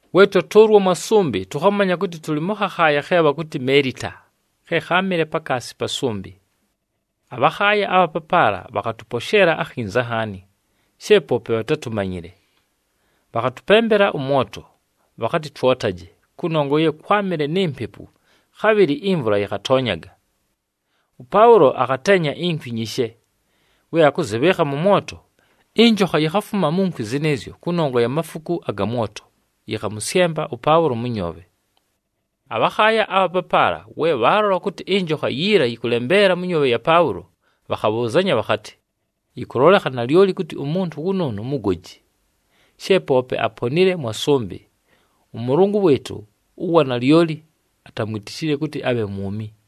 We twatʉʉlwa mwa sʉmbɨ, tʉkhamanya kʉtɨ tʉlɨ mʉ khakhaaya khe bhakʉtɨ Meelita, khe kháamɨle pakaasi pa sʉmbɨ. Abhakhaaya abha papaala bhakhatʉposheela akhinza nhaani, she poope bhatátumanyile. Bhakhatʉpembela ʉmwoto, bhakhatɨ twotaje, kʉnongwa ye kwámɨle ni mpepu, khabhɨlɨ imvula yɨkhatoonyaga. ɄPaʉlo akhateenya inkwi nyishe. We akʉzɨbhɨɨkha mʉ mwoto, ɨnjokha yikhafuma mu nkwi zɨnɨɨzyo kʉnongwa ya mafuku aga mwoto, yɨkhamʉsyemba ʉPaʉlo mʉ nyoobhe. Abhakhaaya abha papaala, we bhaalola kʉtɨ ɨnjokha yiila yɨkʉlembeela mʉ nyoobhe ya Paʉlo, bhakhabhʉʉzanya bhakhatɨ, “Yɨkʉlolekha nalyoli kʉtɨ umuntu wʉnʉʉnʉ mugoji. She poope aponile mwa sʉmbɨ, ʉmʉlʉngʉ wɨɨtʉ ‘ʉWa Nalyoli’ atamwitishile kʉtɨ abhe mwumi.”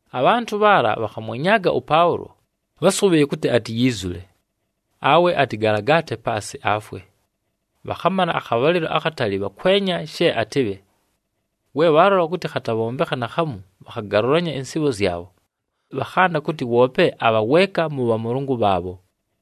Abhantʉ bhaala bhakhamwenyaaga ʉPaʉlo, bhasʉbhɨɨye kʉtɨ atiyiizule, awe atɨgalagaate paasɨ, afwe. Bhakhamala akhabhalɨlo akhatali bhakwenya she atɨbhe. We bhaalola kʉtɨ khatabhombekha naakhamu, bhakhagalʉlanya ɨnsɨɨbho zyabho, bhakhanda kʉtɨ woope abha weeka mʉ bhamʉlʉngʉ bhaabho.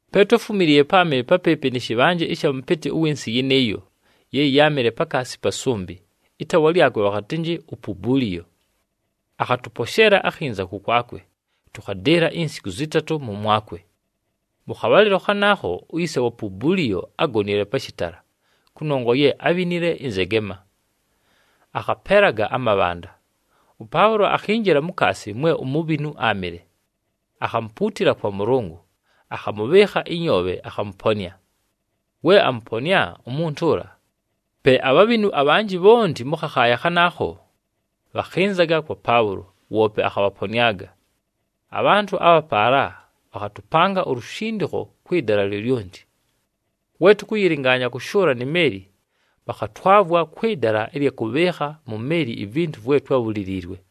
Pe twáfumiliiye páamɨle papɨɨpɨ nɨ shɨbhanje ɨsha mʉpɨtɨ ʉwɨ nsɨ yɨnɨɨyo ye yáamɨle pakaasi pa sʉmbɨ, ɨtaawa lyakwe bhakhatɨnjɨ uPubuliyo. Akhatʉposheela akhinza kʉkwakwe, tʉkhadɨɨla insiku zɨtatʉ mʉmwakwe. Mʉ khabhalɨlo khanaakho, uyise wa Pubuliyo ágonile pa shɨtala, kʉnongwa ye ábhinile ɨnzegema, akhapeelaga amabhanda. ɄPaʉlo akhinjila mukaasi mwe umubhinu áamɨle. Akhamupuutila kwa Mʉlʉngʉ, akhamʉbhɨɨkha ɨnyoobhe akhamʉponɨa. We amʉponɨa umuntu ʉla, pe abhabhinu abhanjɨ bhonti mʉ khakhaaya khanaakho, bhakhɨnzaga kwa Paʉlo, woope akhabhaponɨaga. Abhantʉ abha paala bhakhatʉpanga ulushindikho kwɨ dala lyolyonti. We tʉkʉyɨlɨngaanya kʉshʉʉla ni meeli, bhakhatwavwa kwɨ dala ɨlya kʉbhɨɨkha mu meeli ivintu vwe twábhuliliilwe.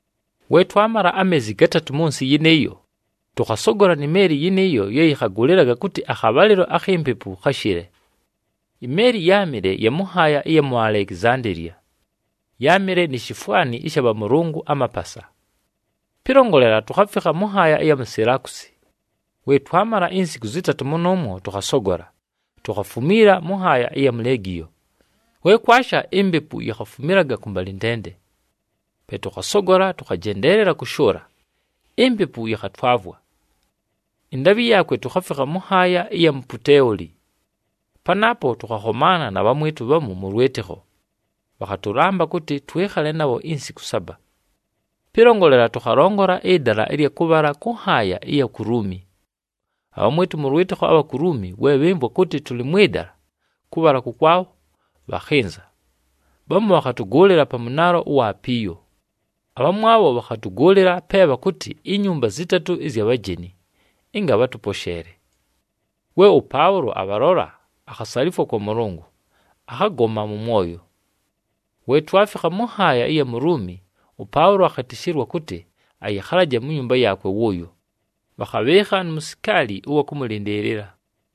We twamala ameezi gatatʉ mʉ nsɨ yɨnɨɨyo, tʉkhasogola ni meeli yɨnɨɨyo ye yɨkhagʉlɨlaga kʉtɨ akhabhalɨlo akhi mpepu khashɨle. Imeeli yáamɨle ya mʉ nhaaya ɨya mu Alekizandeeliya, yáamɨle ni shifwani ɨsha bhamʉlʉngʉ amapasa. Pɨlongolela, tukhafikha mʉ nhaaya ɨya mu Silakusi. We twamala insiku zɨtatʉ mʉnʉʉmwo, tʉkhasogola, tukhafumiila mʉ nhaaya ɨya mu Legiyo. We kwasha, impepu yikhafumilaga kʉmbalɨntende. Pe tʉkhasogola, tʉkhajendeelela kʉshʉʉla, impepu yɨkhatwavwa. Ɨndaabhɨ yaakwe tukhafikha mʉ nhaaya ɨya mu Puteoli. Panaapo tʉkhakhomaana na bhamwɨtʉ bhamu mʉ lwɨtɨkho, bhakhatʉlamba kʉtɨ twɨkhale nabho insiku saba. Pɨlongolela, tʉkhalongola ɨdala ɨlya kʉbhala kʉ nhaaya ɨya ku Luumi. Abhamwɨtʉ mʉ lwɨtɨkho abha ku Luumi, we bhɨmvwa kʉtɨ tʉlɨ mwɨ dala kʉbhala kʉkwabho, bhakhɨnza. Bhamu bhakhatʉgʉʉlɨla pa Mʉnaalo wa Apiyo, abhamwabho bhakhatʉgʉʉlɨla pe bhakʉtɨ iNyumba Zɨtatʉ ɨzya Bhajeni, ɨnga bhatʉposheele. We ʉPaʉlo abhalola, akhasalifwa kwa Mʉlʉngʉ, akhagoma mʉ mwoyo. We twafikha mʉ nhaaya ɨya mu Luumi, ʉPaʉlo akhɨtɨshɨlwa kʉtɨ ayɨkhalaje mu nyumba yaakwe wʉʉyo, bhakhabhɨɨkha nu musikaali ʉwa kʉmʉlɨndɨɨlɨla.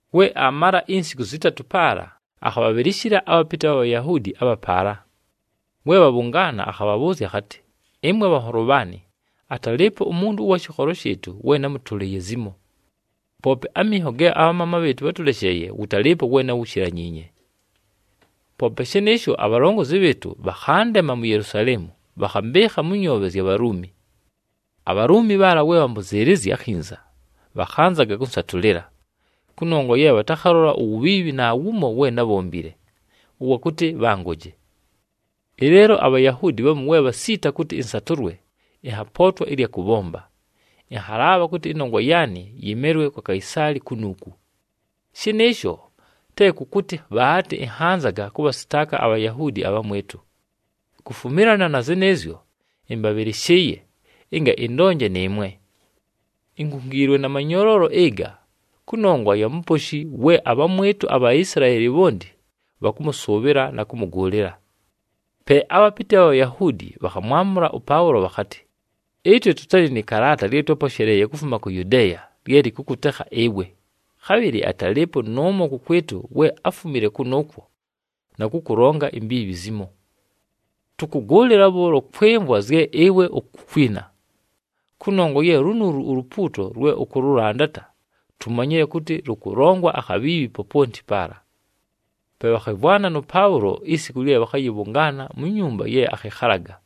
We aamala insiku zɨtatʉ paala, akhabhabhɨlɨshɨla abhapɨtɨ bha Bhayahuudi abha paala. We bhabhʉngaana, akhabhabhʉʉzya akhatɨ, “Ɨmwe bhanholo bhaanɨ, atalɨɨpo umuntu ʉwa shɨkholo shɨɨtʉ we námʉtʉlɨɨye zimo. Poope aminho ge abhamaama bhɨɨtʉ bhátʉlesheeye, wʉtalɨɨpo we náwushilanyiinye. Poope shɨnɨɨsho, abhalongozi bhɨɨtʉ bhakhandema mu Yelusaleemu, bhakhambɨɨkha mʉ nyoobhe zya Bhaluumi. ABhaluumi bhaala we bhambʉzɨɨlɨzya akhinza, bhakhanzaga kʉnsatʉlɨla, kʉnongwa ye bhatakhalola uwubhiibhi naawumo we nábhombile, ʉwa kʉtɨ bhangoje. Ɨleelo aBhayahuudi bhamu we bhasiita kʉtɨ ɨnsatʉlwe, ɨnhapootwa ɨlya kʉbhomba, ɨnhalaabha kʉtɨ ɨnongwa yaanɨ yɨmelwe kwa Kaisaali kunuuku. Shɨnɨɨsho te kʉ kʉtɨ bhaatɨ ɨnhanzaga kʉbhasɨtaaka aBhayahuudi abhamwɨtʉ. Kufumilana na zɨnɨɨzyo, ɨmbabhɨlɨshɨɨye, ɨnga ɨndonje nɨɨmwe. Inkungiilwe na manyoloolo ɨga, kʉnongwa ya Muposhi we abhamwɨtʉ aBhaisilaeli bhonti bhakʉmʉsʉʉbhɨla na kʉmʉgʉʉlɨla.” Pe abhapɨtɨ bha Bhayahuudi bhakhamwamʉla ʉPaʉlo bhakhatɨ, “Ɨtwe tʉtalɨ nɨ kalaata lye twáposheleeye kufuma ku Yudeeya lye lɨkʉkʉtekha ɨwe, khabhɨlɨ atalɨɨpo nʉʉmo kʉkwɨtʉ we áfumile kʉnʉʉkwo, na kʉkʉlonga imbiibhi zimo. Tʉkʉgʉʉlɨla bhʉʉlo kwɨmvwa zye ɨwe ukukwina, kʉnongwa ye lunuulu ulupuuto lwe ʉkʉlʉlandata, tumanyile kʉtɨ lʉkʉlongwa akhabhiibhi poponti paala.” Pe bhakhɨmvwana nʉ Paʉlo isiku lye bhakhayɨbhʉngaana mu nyumba ye akhɨkhalaga.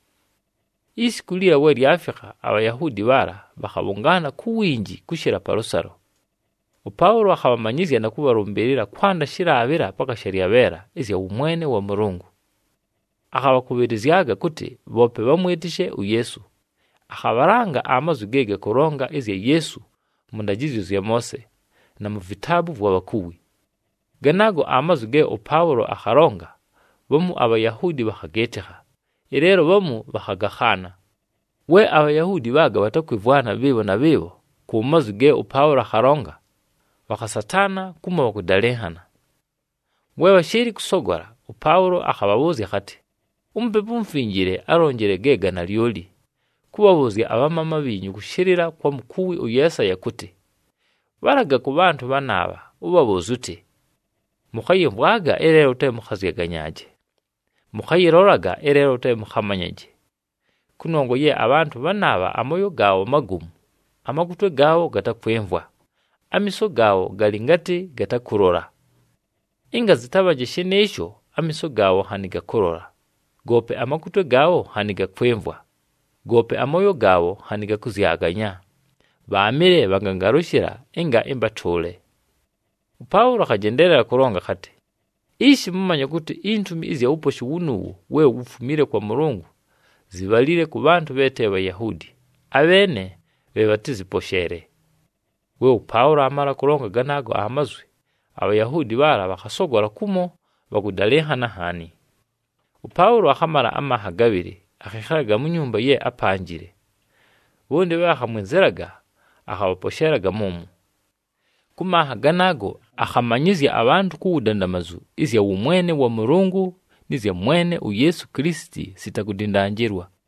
Isiku liila we lyafikha, aBhayahuudi bhaala bhakhabhʉngaana ku winji kʉshɨla palʉsalo. ɄPaʉlo akhabhamanyɨzya na kʉbhalʉmbɨɨlɨla kwanda shɨlaabhɨla paka shalyabheela ɨzya wʉmwene wa Mʉlʉngʉ. Akhabhakʉbhɨlɨzyaga kʉtɨ bhoope bhamwɨtɨshe uYeesu, akhabhalanga amazwi ge gakʉlonga ɨzya Yeesu mʉ ndajɨzyo zya Moose, na mu vitaabu vwa bhakuwi. Ganaago amazwi ge ʉPaʉlo akhalonga, bhamu aBhayahuudi bhakhagɨɨtɨkha, ɨleelo bhamu bhakhagakhaana. We aBhayahuudi bhaaga bhatakwɨmvwana bhɨɨbho na bhɨɨbho ku mazwi ge ʉPaʉlo akhalonga, bhakhasataana kumo bhakʉdalɨnhana. We bhashɨɨlɨ kʉsogola, ʉPaʉlo akhabhabhʉʉzya akhatɨ, “UMupepu uMufinjile álonjile ge ga nalyoli, kʉbhabhʉʉzya abhamaama bhiinyu kʉshɨlɨla kwa mukuwi ʉYeesaya kʉtɨ, ‘Bhalaga kʉ bhantʉ bhanaabha, ʉbhabhʉʉzye ʉtɨ, “Mʉkhayɨmvwaga, ɨleelo te mʉkhazyaganyaaje. Mʉkhayɨlolaga, ɨleelo te mʉkhamanyaje. Kʉnongwa ye abhantʉ bhanaabha amooyo gaabho magomu, amakutwe gaabho gatakwɨmvwa, amiiso gaabho galɨ ngatɨ gatakʉlola. Ɨnga zɨtabhanje shɨnɨɨsho, amiiso gaabho nhanɨ gakʉlola, goope amakutwe gaabho nhanɨ gakwɨmvwa, goope amooyo gaabho nhanɨ gakʉzyaganya, bhaamɨle bhagangalʉshɨla, ɨnga ɨmbatʉʉle.”’” ɄPaʉlo akhajendeelela kʉlonga akhatɨ, “Ishi! Mʉmanye kʉtɨ intumi ɨzya wuposhi wunuuwu we wufumile kwa Mʉlʉngʉ zibhalile kʉ bhantʉ bhe te Bhayahuudi, abheene bhe bhatɨzɨposheele.” [ We ʉPaʉlo aamala kʉlonga ganaago amazwi, aBhayahuudi bhaala bhakhasogola kumo bhakʉdalɨnhana nhaani.] ɄPaʉlo akhamala amanha gabhɨlɨ, akhɨkhalaga mu nyumba ye ápanjile. Bhonti bhe bhakhamwɨnzɨlaga, akhabhaposheelaga mʉmwo. Kʉ manha ganaago, akhamanyɨzya abhantʉ ku wudandamazu ɨzya wʉmwene wa Mʉlʉngʉ, nɨ zya Mwene uYeesu Kilisiti, sita kudindanjilwa.